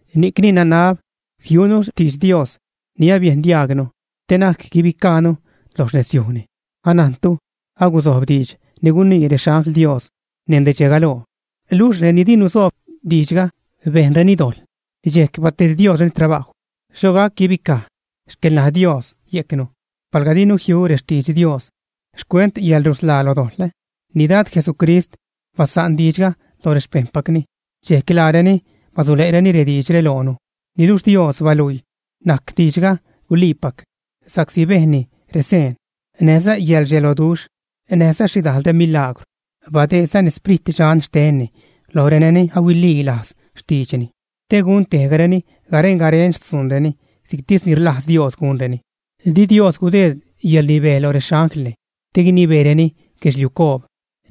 Ni'cni nanab jiunu xtidx Dios ni abiejn diajgnu, te na'c guibicajnu lo xnezyujni. Anajntu aguzojb diidx ni gunii rexangl Dios neṉ redxe galoo. Luxh reni di nusoob diidxga bejnreni dojḻ, dxejc bateed Diosreni trabajw. ¿Xho gac guibicaj xcäḻnaj Dios yejcnu palga dinu jiu rextidx Dios xcuent yäḻrusḻaa lo dojḻ, ä? Ni Dad, Jesucrist basa'n diidxga lo rexpejṉpacni, dxejc laareni basule'reni rediidxre loonu. Niluxh Dios baluii najc diidxga guliipac sa'csi bejnni reseen, näjza yäḻrdxeloduxh, näjza xhidajl remilagrw. Badeedzani Sprit Dxan xtenni loj renani ahuililajz xtiidxni te gun tejgareni garen-garen xtzuunreni si'ctis ni rlajz Dios gunreni. Di Dios gudeed yäḻrnibee lo rexanglni te guinibeereni guedxliucoob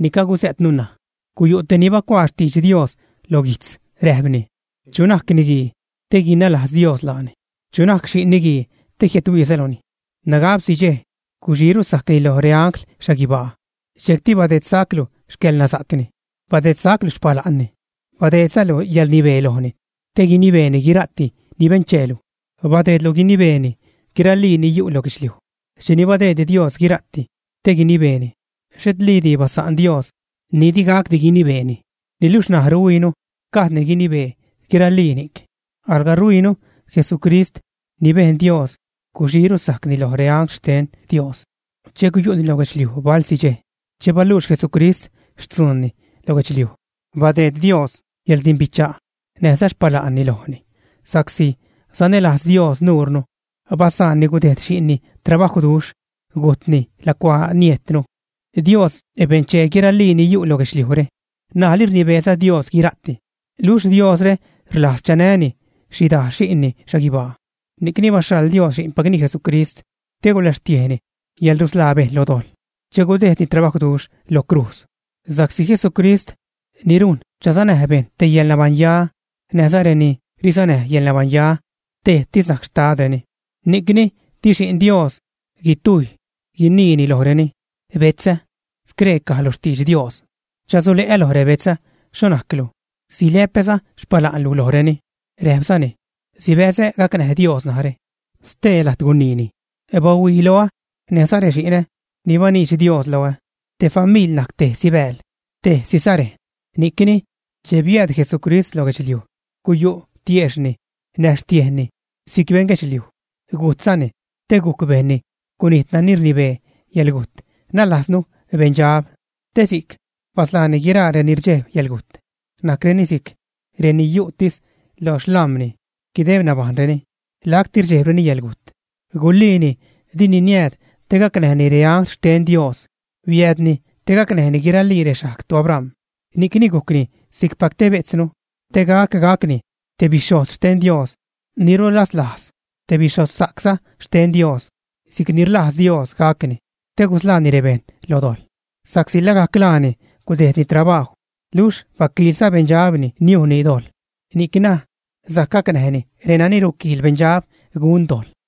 ni cagusä'tnu ṉaj. Guyu' tej ni bacuaa xtidx Dios lo guijtz, räjpni: ¿Chu najc niguii, te guinalajz Dios laani? ¿Chu najc xi'n niguii te jiädhuiizaluni? Nagabsi dxej guxiiru sajcni lo reangl xhaguibaa, dxejcti badedsaclu xcäḻnasa'cni, badedsaclu xpala'nni, badeedzalu yäḻrnibee lojni te guinibeeni guira'ti ni bencheelu. Badeedlu guinibeeni guiralii ni yu' lo guedxliuj. Cheni badeed Dios guira'ti te guinibeeni, xhetliidi basa'n Dios ni digacdi guinibeeni, niluxh ṉaj ruhuiinu gajdni guinibee guiralii ni'c. Alga rhuiinu Jesucrist, ni bejn Dios guxiiru sajcni lo reangl xten Dios che guyu'ni lo guedxliuj balsi dxej. Che baluux Jesucrist xtzuunni lo guedxliuj, badeed Dios yäḻrdimbicha' näjza xpala'nni lojni. Sa'csi sanälajz Dios nuurnu basaanni gudejd Xi'nni trabajwduxh, gujtni lacuaa niejtnu. Dios benchee guiralii ni yu' lo guedxliujre, ṉajli rnibeeza Dios guira'ti. Luxh Diosre rlajz chanäni xhidajl xi'nni xhaguibaa, ni'cni baxhaḻ Dios xi'npacni Jesucrist te guläxtiejni yäḻrusḻaa bejṉ lo dojḻ che gudejdni trabajwduxh lo crujz. Sa'csi Jesucrist, ni rujn chasanäj bejṉ te yäḻnabaṉya, näjza reni risanäj yäḻnabaṉya, tejtis najc xtadreni. Ni'cni di Xi'n Dios guitujy guiniini lojreni: “betzä”. Scree caj lo xtidx Dios: Chasule'ä lo rebetzä xho najclu, siliä'päza xpala'nlu lojreni. Räjpzani: Sibäzä gacnäj Dios narä. Ste lajt guniini: Bahuii loä näjza rexi'nä ni baniidx Dios loä. Te famiḻ najc tejsi bääl, tejsiza rejn; ni'cni che biääd Jesucrist lo guedxliuj guyu' tiejxhni näj xtiejnni si'c beṉguedxliuj, gujtzani te gujc bejnni gunijt nani rnibee yäḻgujt, nalajznu, beṉdxab. Te si'c basḻaani guiraa reni rdxejb yäḻgujt, najcreni si'c reni yu'tis loj xlam̲ni guideb nabajṉreni, lacti rdxejbreni yäḻgujt. Guliini dini niääd te gacnäjni reangl xten Dios, biäädni te gacnäjni guiralii rexajg toAbram. Ni'cni gujcni si'cpac te bejtznu, te gac gacni te bixhojz xten Dios ni rulaslajz, te bixhozsa'cza xten Dios, si'cni rlajz Dios gacni te gusḻaani rebejṉ lo dojḻ. Sa'csi lagajc laani gudejdni trabajw, luxh baquiilza beṉdxabni niujnni dojḻ, ni'c ṉaj sajc gacnäjni renani ruquiil beṉdxab gun dojḻ.